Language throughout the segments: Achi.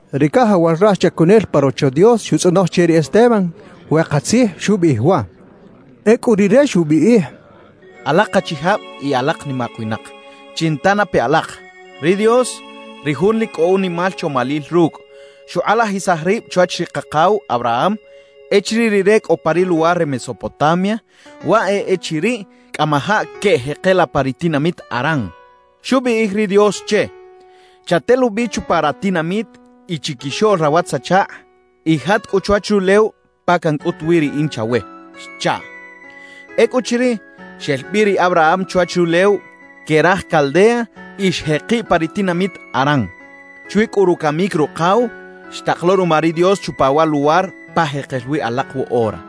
Ri cajawal raj chacunel pa Rocho Dios xutzꞌonoj che ri Esteban we katzij xubiꞌij waꞌ. Ecꞌu rire xubiꞌij: «Alak achijab y alak nimak winak, chinta na pe alak. Ri Dios, ri Jun lic cꞌo unimal chomalil rucꞌ, xukꞌalajisaj rib chwach ri kakaw Abraham echiriꞌ rire cꞌo pa ri luwar re Mesopotamia, waꞌ e echiriꞌ cꞌamajaꞌ queꞌjekela pa ri tinamit Harán. Xubiꞌij ri Dios che: “Chatelubi chupa ratinamit y chiquixoꞌl rawatz-achakꞌ; y jat cꞌu chwach rulew pa cancꞌut wi riꞌin chawe” xchaꞌ. Ecꞌuchiriꞌ, xel bi ri Abraham chwach rulew que raj Caldea y xjekiꞌ pa ri tinamit Harán. Chwi cꞌu rucamic rukaw, xtak lo ruma ri Dios chupa wa luwar pa jekel wi alak woꞌora.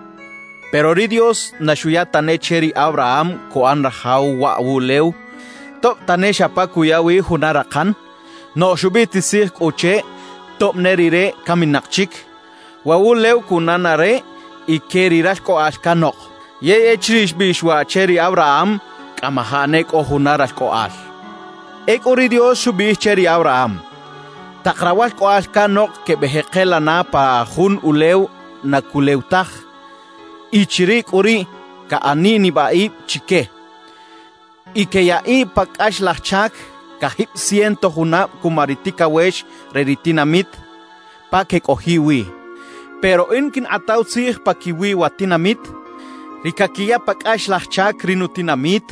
»Pero ri Dios na xuya tane che ri Abraham cuꞌan rajaw waꞌ wuꞌlew, tob tane xa pa cuya wi juna rakan. Noꞌj xubiꞌtisij cꞌu che tob ne rire caminak chic, waꞌ wuꞌlew cuꞌana na re y que ri ralcꞌoꞌal canok; yey echiriꞌ xbiꞌx waꞌ che ri Abraham, cꞌamajaꞌ ne cꞌo juna ralcꞌoꞌal. Ecꞌu ri Dios xubiꞌij che ri Abraham: Tak rawalcꞌoꞌal canok quebeꞌjekela na pa jun ulew na culew taj. Y chiriꞌ cꞌu riꞌ caꞌaniꞌ nibaꞌib chique y queyaꞌiꞌ pa cꞌaxlaj chac cajib ciento junab cuma ri ticawex re ri tinamit pa quecꞌojiꞌ wi. Pero In quinkꞌataw tzij paquiwi wa tinamit, ri caquiya pa cꞌaxlaj chac ri nutinamit.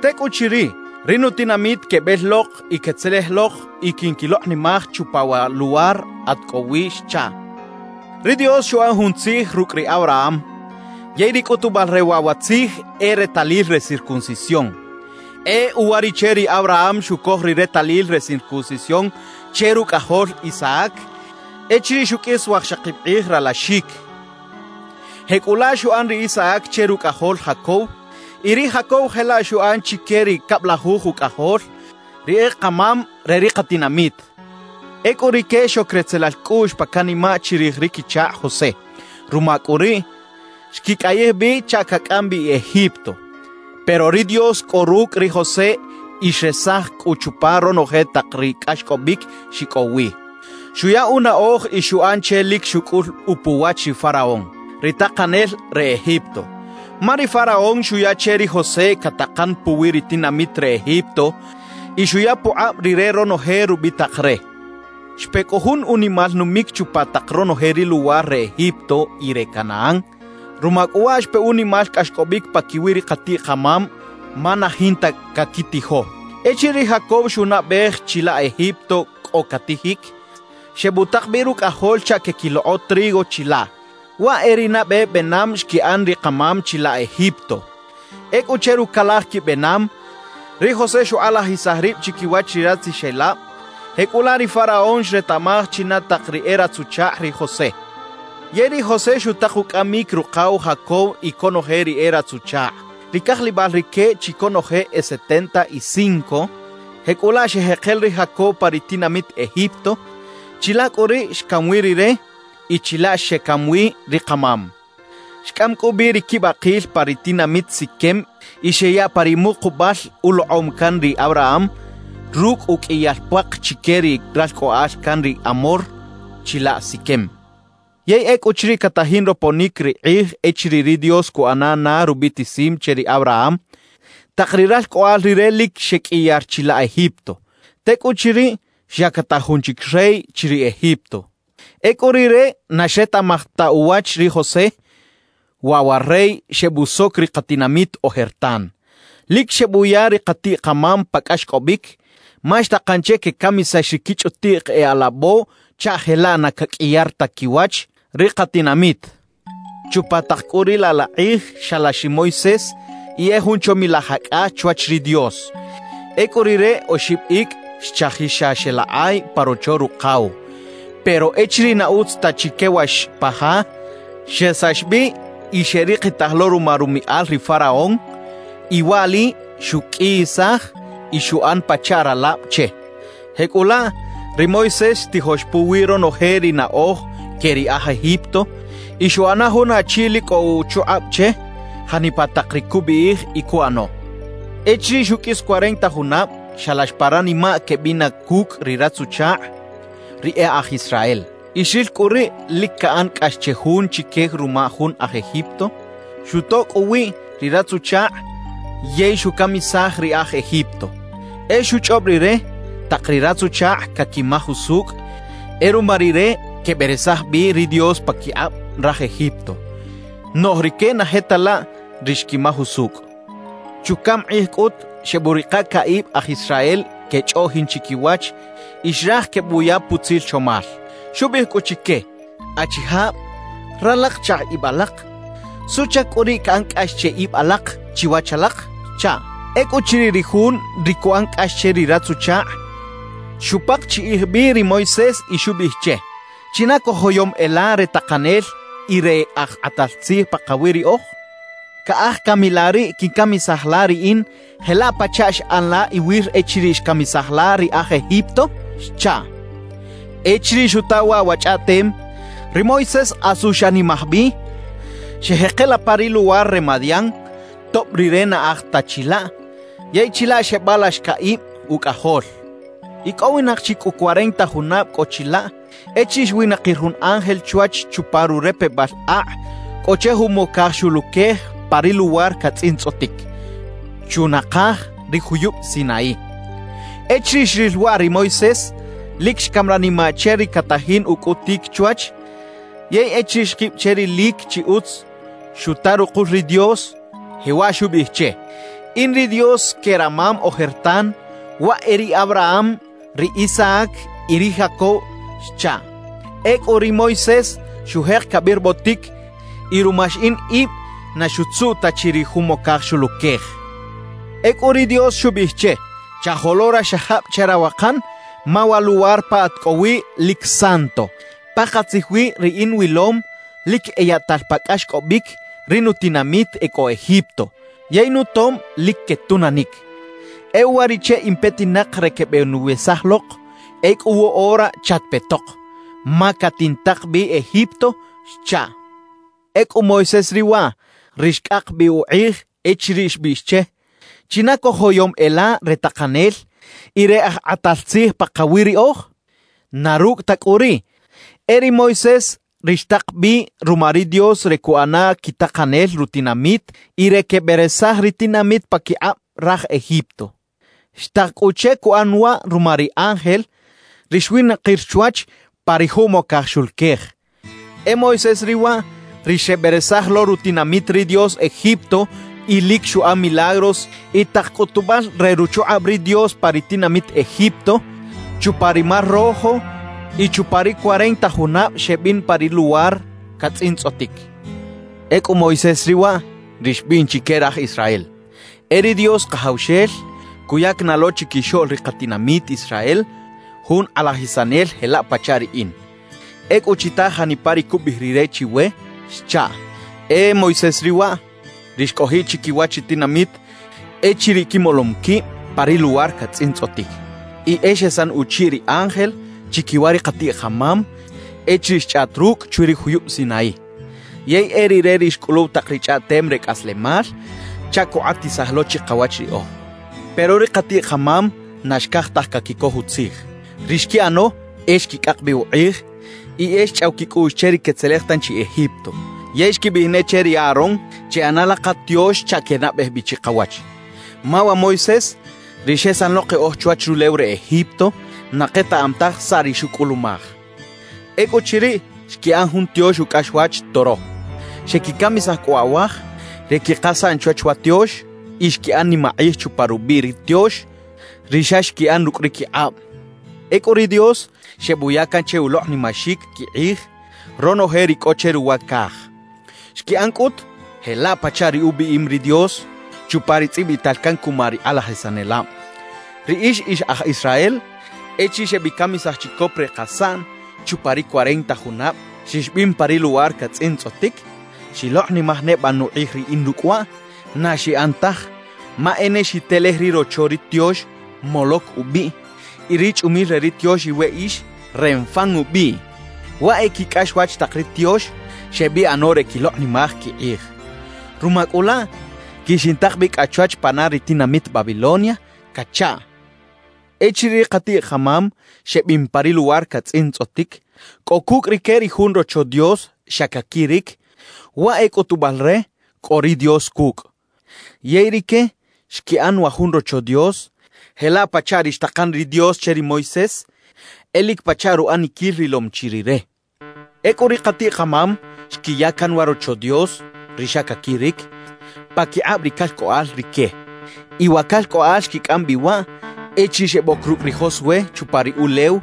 Tecꞌuchiriꞌ, ri nutinamit quebel lok y quetzelej lok y quinquilokꞌnimaj chupa wa luwar at cꞌo wi xchaꞌ. »Ri Dios xuꞌan jun tzij rucꞌ ri Abraham, yey ri cꞌutubal re waꞌ wa tzij e ri retalil re circuncisión. E uwariꞌche ri Abraham xucoj ri retalil re circuncisión che rucꞌajol Isaac echiriꞌ xuqꞌuis wajxakib kꞌij ralaxic. Jecꞌulaꞌ xuꞌan ri Isaac che rucꞌajol Jacob. Y ri Jacob jelaꞌ xuꞌan chique ri cablajuj ucꞌajol, ri e kamam re ri katinamit. »Ecꞌu rique xoc retzelal cꞌuꞌx pa canimaꞌ chirij ri quichakꞌ José. Ruma cꞌu riꞌ, xquicꞌayij bi chaꞌ cacꞌam bi Egipto. Pero ri Dios cꞌo rucꞌ ri José y xresaj cꞌu chupa ronoje tak ri cꞌaxcꞌobic xicꞌow wi. Xuya unaꞌoj y xuꞌan che lic xucꞌul upuwach ri faraón, ri takanel re Egipto. Ma ri faraón xuya che ri José catakan puwi ri tinamit re Egipto y xuya pukꞌab rire ronoje rubitak re. »Xpe cꞌu jun unimal numic chupa tak ronoje ri luwar re Egipto y re Canaán. Ruma cꞌu waꞌ xpe unimal cꞌaxcꞌobic paquiwi ri katiꞌ-kamam ma na jinta caquitijo. »Echiriꞌ ri Jacob xunaꞌbej chilaꞌ Egipto cꞌo catijic, xebutak bi rucꞌajol chaꞌ queꞌquilokꞌo trigo chilaꞌ. Waꞌ e ri nabe benam xquiꞌan ri kamam chilaꞌ Egipto. Ecꞌu che rucalaj quibenam, ri José xukꞌalajisaj rib chiquiwach ri ratzixelab. Jecꞌulaꞌ ri faraón xretaꞌmaj china tak ri e ratz-uchakꞌ ri José. »Yey ri José xutak ucꞌamic rukaw Jacob y conoje ri e ratz-uchakꞌ. Ri cajlibal rique chi conoje e setenta y cinco. Jecꞌulaꞌ xeꞌjekela ri Jacob pa ri tinamit Egipto. Chilaꞌ cꞌu riꞌ xcam wi rire y chilaꞌ xecam wi ri kamam. Xcꞌam cꞌu bi ri quibakil pa ri tinamit Siquem y xeyaꞌ pa ri mukubal ulokꞌom can ri Abraham rucꞌ uqꞌuiyal puak chique ri ralcꞌoꞌal can ri Hamor, chilaꞌ Siquem. »Yey ecꞌuchiriꞌ catajin roponic ri kꞌij echiriꞌ ri Dios cuꞌana na rubiꞌtisim che ri Abraham, tak ri ralcꞌoꞌal rire lic xeqꞌuiyar chilaꞌ Egipto. Tecꞌuchiriꞌ, xyactaj jun chic rey chiriꞌ Egipto; ecꞌu rire na xretaꞌmaj ta uwach ri José. Waꞌ wa rey xebusoc ri katinamit ojertan. Lic xebuya ri katiꞌ-kamam pa cꞌaxcꞌobic, ma xtakan che quecamisax ri quichꞌutiꞌk e alabo chaꞌ jelaꞌ na caqꞌuiyar ta quiwach ri katinamit. »Chupa tak cꞌu riꞌ laꞌ la kꞌij xalax ri Moisés y e jun chomilaj acꞌa chwach ri Dios. Ecꞌu rire oxib icꞌ xchajix xa xeꞌlakꞌay pa rocho rukaw. Pero echiriꞌ na utz ta chi quewax pa ja, xesax bi y xeꞌrikitaj lo ruma rumiꞌal ri faraón; y waꞌli xuqꞌuiyisaj y xuꞌan pachaꞌ ralab che. Jecꞌulaꞌ, ri Moisés xtijox puwi ronoje ri naꞌoj que ri aj Egipto, y xuꞌana jun achi lic cꞌo uchukꞌab che janipa tak ri cubiꞌij y cuꞌano. »Echiriꞌ xuqꞌuis cuarenta junab, xalax pa ranimaꞌ queꞌbina cucꞌ ri ratz-uchakꞌ, ri e aj Israel. Y xril cꞌu riꞌ lic caꞌan cꞌax che jun chique ruma jun aj Egipto. Xutoꞌ cꞌu uwiꞌ ri ratz-uchakꞌ yey xucamisaj ri aj Egipto. E xuchꞌob rire, tak ri ratz-uchakꞌ caquimaj usucꞌ e ruma rire queberesaj bi ri Dios paquikꞌab raj Egipto; noꞌj rique na je ta laꞌ ri xquimaj usucꞌ. »Chucaꞌm kꞌij cꞌut xebuꞌrika caꞌib aj Israel quechꞌoꞌjin chiquiwach y xraj quebuya putzil chomal. Xubiꞌij cꞌu chique: “Achijab, ralak chakꞌ ib alak. ¿Suꞌchac cꞌu riꞌ caꞌan cꞌax che ib alak chiwach alak?” xchaꞌ. »Ecꞌuchiriꞌ, ri jun ri cuꞌan cꞌax che ri ratz-uchakꞌ, xupakchiꞌij bi ri Moisés y xubiꞌij che: “¿China cojoyom e la re takanel y re aj kꞌatal tzij pakawi riꞌoj? ¿Caꞌaj cami la riꞌ quincamisaj la riꞌin jelaꞌ pachaꞌ xꞌan la iwir echiriꞌ xcamisaj la ri aj Egipto?” xchaꞌ. »Echiriꞌ xuta waꞌ wa chꞌaꞌtem, ri Moisés asu xanimaj bi, xeꞌjekela pa ri luwar re Madián, tob rire na aj ta chilaꞌ. Yey chilaꞌ xebalax caꞌib ucꞌajol. »Icꞌowinak chi cꞌu cuarenta junab cꞌo chilaꞌ echiriꞌ xwinakir jun ángel chwach chupa rurepebal akꞌ cꞌo che jumocaj xuluquej pa ri luwar catzꞌintzꞌotic, chunakaj ri juyub Sinaí. Echiriꞌ xril waꞌ ri Moisés, lic xcam ranimaꞌ che ri catajin ucꞌutic chwach. Yey echiriꞌ xkib che rilic chi utz, xuta rukul ri Dios, jewaꞌ xubiꞌij che: “In ri Dios que ramam ojertan, waꞌ e ri Abraham, ri Isaac y ri Jacob” xchaꞌ. »Ecꞌu ri Moisés xujek cabirbotic y ruma xiꞌin ib na xutzuꞌ ta chi ri jumocaj xuluquej. »Ecꞌu ri Dios xubiꞌij che: “Chajolo raxajab che rawakan ma wa luwar pa at cꞌo wi lic santo. Pakatzij wi riꞌin wilom lic eyaꞌtal pa cꞌaxcꞌobic ri nutinamit e cꞌo Egipto, yey nutom lic quetunanic. E uwariꞌche in petinak re quebeꞌnuwesaj lok. Ecꞌu woꞌora chatpetok; ma catintak bi Egipto” xchaꞌ. »Ecꞌu Moisés riꞌ waꞌ, ri xcꞌak bi ukꞌij echiriꞌ xbiꞌx che: “¿China cojoyom e la re takanel y re aj kꞌatal tzij pakawi riꞌoj?” Na rucꞌ ta cꞌu riꞌ, e ri Moisés ri xtak bi ruma ri Dios re cuꞌana quitakanel rutinamit y re queberesaj ri tinamit paquikꞌab raj Egipto. Xtak cꞌu che cuꞌan waꞌ ruma ri ángel, ri xwinakir chwach pa ri jumocaj xuluquej. E Moisés riꞌ waꞌ, ri xeberesaj lo rutinamit ri Dios Egipto y lic xuꞌan milagros y tak cꞌutubal re ruchukꞌab ri Dios pa ri tinamit Egipto, chupa ri Mar Rojo y chupa ri cuarenta junab xebin pa ri luwar catzꞌintzꞌotic. »Ecꞌu Moisés riꞌ waꞌ, ri xbiꞌn chique raj Israel: E ri Dios Kajawxel cuyac na lo chiquixoꞌl ri katinamit Israel jun Kꞌalajisanel jelaꞌ pachaꞌ riꞌin. Ecꞌu chita janipa ri cubiꞌij Rire chiwe xchaꞌ. »E Moisés riꞌ waꞌ, ri xcꞌojiꞌ chiquiwach ri tinamit echiriꞌ quimolom quib pa ri luwar catzꞌintzꞌotic, y e xesan uchiꞌ ri ángel chiquiwa ri katiꞌ-kamam echiriꞌ xchꞌaꞌt rucꞌ chwi ri juyub Sinaí. Yey e rire ri xcꞌuluw tak ri chꞌaꞌtem re cꞌaslemal chaꞌ cukꞌatisaj lo chikawach riꞌoj. »Pero ri katiꞌ-kamam na xcaj taj caquicoj utzij; ri xquiꞌano e xquicꞌak bi ukꞌij y e xchꞌaw quicꞌuꞌx che ri quetzelej tanchi Egipto. Yey xquibiꞌij ne che ri Aarón: “Cheꞌana la katiox chaꞌ quenabej bi chikawach; ma wa Moisés, ri xesan lo keꞌoj chwach rulew re Egipto, na ketaꞌam taj saꞌ ri xucꞌulumaj.” Ecꞌuchiriꞌ, xquiꞌan jun tiox ucꞌaxwach toro. Xequicamisaj cꞌu awaj re quikasaꞌn chwach wa tiox y xquiꞌan nimakꞌij chupa rubiꞌ ri tiox, ri xa xquiꞌan rucꞌ ri quikꞌab. »Ecꞌu ri Dios xebuya can che ulokꞌnimaxic quikꞌij ronoje ri cꞌo che ruwa caj. Xquiꞌan cꞌut jelaꞌ pachaꞌ ri ubiꞌim ri Dios chupa ri tzꞌibital can cuma ri kꞌalajisanelab: Riꞌix ix aj Israel, echiriꞌ xebicamisaj chicop re kasaꞌn chupa ri cuarenta junab xixbin pa ri luwar catzꞌintzꞌotic, ¿xilokꞌnimaj neba nukꞌij riꞌin rucꞌ waꞌ? Na xiꞌan taj, ma e ne xitelej ri rocho ri tiox Moloc ubiꞌ y ri chꞌumil re ri tiox iweꞌix, Renfán ubiꞌ. Waꞌ e quicꞌaxwach tak ri tiox xebiꞌano re quilokꞌnimaj quikꞌij. Ruma cꞌu laꞌ quixintak bi cꞌa chwach pana ri tinamit Babilonia cachaꞌ. »Echiriꞌ ri katiꞌ-kamam xebin pa ri luwar catzꞌintzꞌotic, cꞌo cucꞌ rique ri jun Rocho Dios xa caquiric, waꞌ e cꞌutubal re cꞌo ri Dios cucꞌ. Yey rique xquiꞌan wa jun Rocho Dios jelaꞌ pachaꞌ ri xtakan ri Dios che ri Moisés, e lic pachaꞌ ruꞌaniquil rilom chi rire. Ecꞌu ri katiꞌ-kamam xquiya can wa Rocho Dios (ri xa caquiric) paquikꞌab ri calcꞌoꞌal rique. Y wa calcꞌoꞌal xquicꞌam bi waꞌ echiriꞌ xeboc rucꞌ ri Josué chupa ri ulew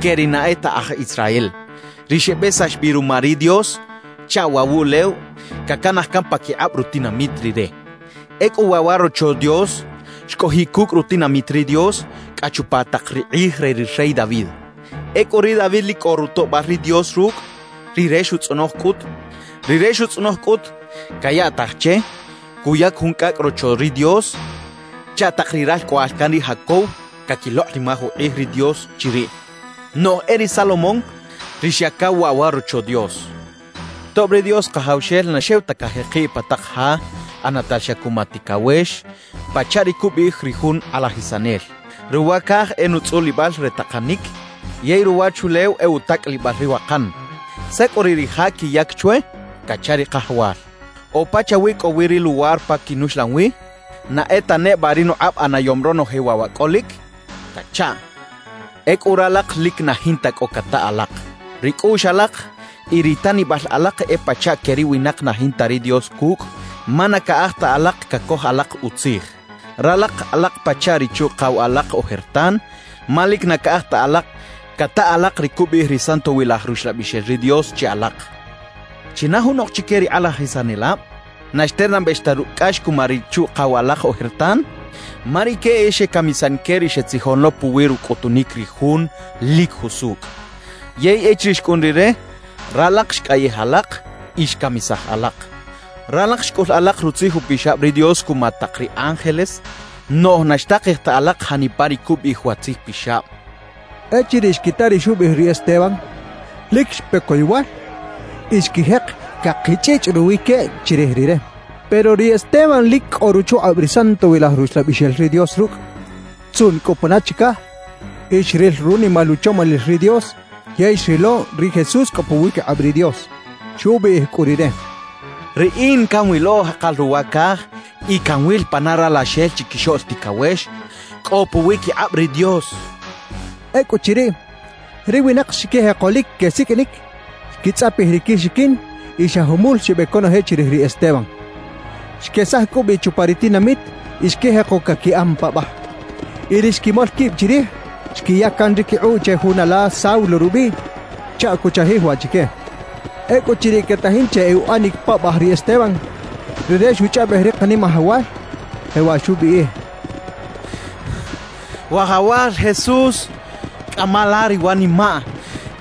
que ri na e ta aj Israel, ri xebesax bi ruma ri Dios chaꞌ waꞌ wuꞌlew cacanaj can paquikꞌab rutinamit Rire. Ecꞌu waꞌ wa Rocho Dios xcꞌojiꞌ cucꞌ rutinamit ri Dios cꞌa chupa tak ri kꞌij re ri rey David. »Ecꞌu ri David lic cꞌo rutoꞌbal ri Dios rucꞌ. Rire xutzꞌonoj cꞌut cayaꞌtaj che cuyac jun cꞌacꞌ Rocho ri Dios chaꞌ tak ri ralcꞌoꞌal can ri Jacob caquilokꞌnimaj ukꞌij ri Dios chiriꞌ. Noꞌj e ri Salomón ri xyacaw waꞌ wa Rocho Dios; tob ri Dios Kajawxel na xew ta cajekiꞌ pa tak ja ꞌanatal xa cuma ticawex, pachaꞌ ri cubiꞌij ri jun kꞌalajisanel: “Ruwa caj e nutzꞌulibal re takanic, yey ruwachulew e utacꞌalibal ri wakan. ¿Saꞌ cꞌu riꞌ ri ja quiyac chwe?” cacha ri Kajawal. “¿O pachawi cꞌowi ri luwar pa quinuxlan wi? ¿Na e ta neba ri nukꞌab ꞌanayom ronoje waꞌ wa cꞌolic?” cachaꞌ. »Ecꞌu ralak lic na jinta cꞌo cata alak. Ri cꞌuꞌx alak y ri tanibal alak e pachaꞌ que ri winak na jinta ri Dios cucꞌ, ma na caꞌaj ta alak cacoj alak utzij. Ralak alak pachaꞌ ri chuꞌkaw alak ojertan, ma lic na caꞌaj ta alak cata alak ri cubiꞌij ri Santowilaj Ruxlabixel ri Dios che alak. ¿China junok chique ri kꞌalajisanelab na xternabex ta rucꞌ cꞌax cuma ri chuꞌkaw alak ojertan? Ma rique e xecamisan que ri xetzijon lo puwi rucꞌutunic ri Jun lic jusucꞌ. Yey echiriꞌ xcꞌun Rire, ralak xcꞌayij alak y xcamisaj alak. Ralak xcꞌul alak Rutzij Upixab ri Dios cuma tak ri ángeles, noꞌj na xtakej ta alak janipa ri cubiꞌij wa Tzij Pixab» xcha ri Esteban. Echiriꞌ xquita ri xubiꞌij ri Esteban, lic xpe coyowal y xquijek cakichꞌichꞌ ruwi queꞌ chirij rire. Pero ri Esteban lic cꞌo ruchukꞌab ri Santowilaj Ruxlabixel ri Dios rucꞌ; xtzuꞌn cꞌu pana chicaj y xril runimal uchomalil ri Dios yey xrilo ri Jesús cꞌo puwiquikꞌab ri Dios. Xubiꞌij cꞌu rire: «¡Riꞌin canwilo jakal ruwa caj y canwil pana Ralaxel Chiquixoꞌl Ticawex cꞌo puwiquikꞌab ri Dios!» xchaꞌ. Ecꞌuchiriꞌ, ri winak xquijeko lic quesiqꞌuinic, xquitzꞌapij ri quixiquin y xa jumul xebec conoje chirij ri Esteban. Xquesaj cꞌu bi chupa ri tinamit y xquijeko caquiꞌan paꞌbaj. Y ri xquimol quib chirij, xquiya can ri quikꞌuꞌ che jun ala Saulo rubiꞌ chaꞌ cuchajij waꞌ chique. Ecꞌuchiriꞌ quetajin che uꞌanic paꞌbaj ri Esteban, rire xuchꞌaꞌbej ri Kanimajawal, jewaꞌ xubiꞌij: «Wajawal Jesús, cꞌama la ri wanimaꞌ» xchaꞌ.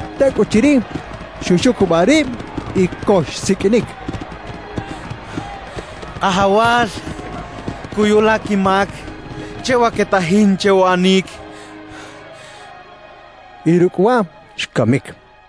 Tecꞌuchiriꞌ, xuxucubaꞌ rib y co xsiqꞌuinic: «Kajawal, cuyu la quimac che wa quetajin che uꞌanic» xchaꞌ. Y rucꞌ waꞌ, xcamic.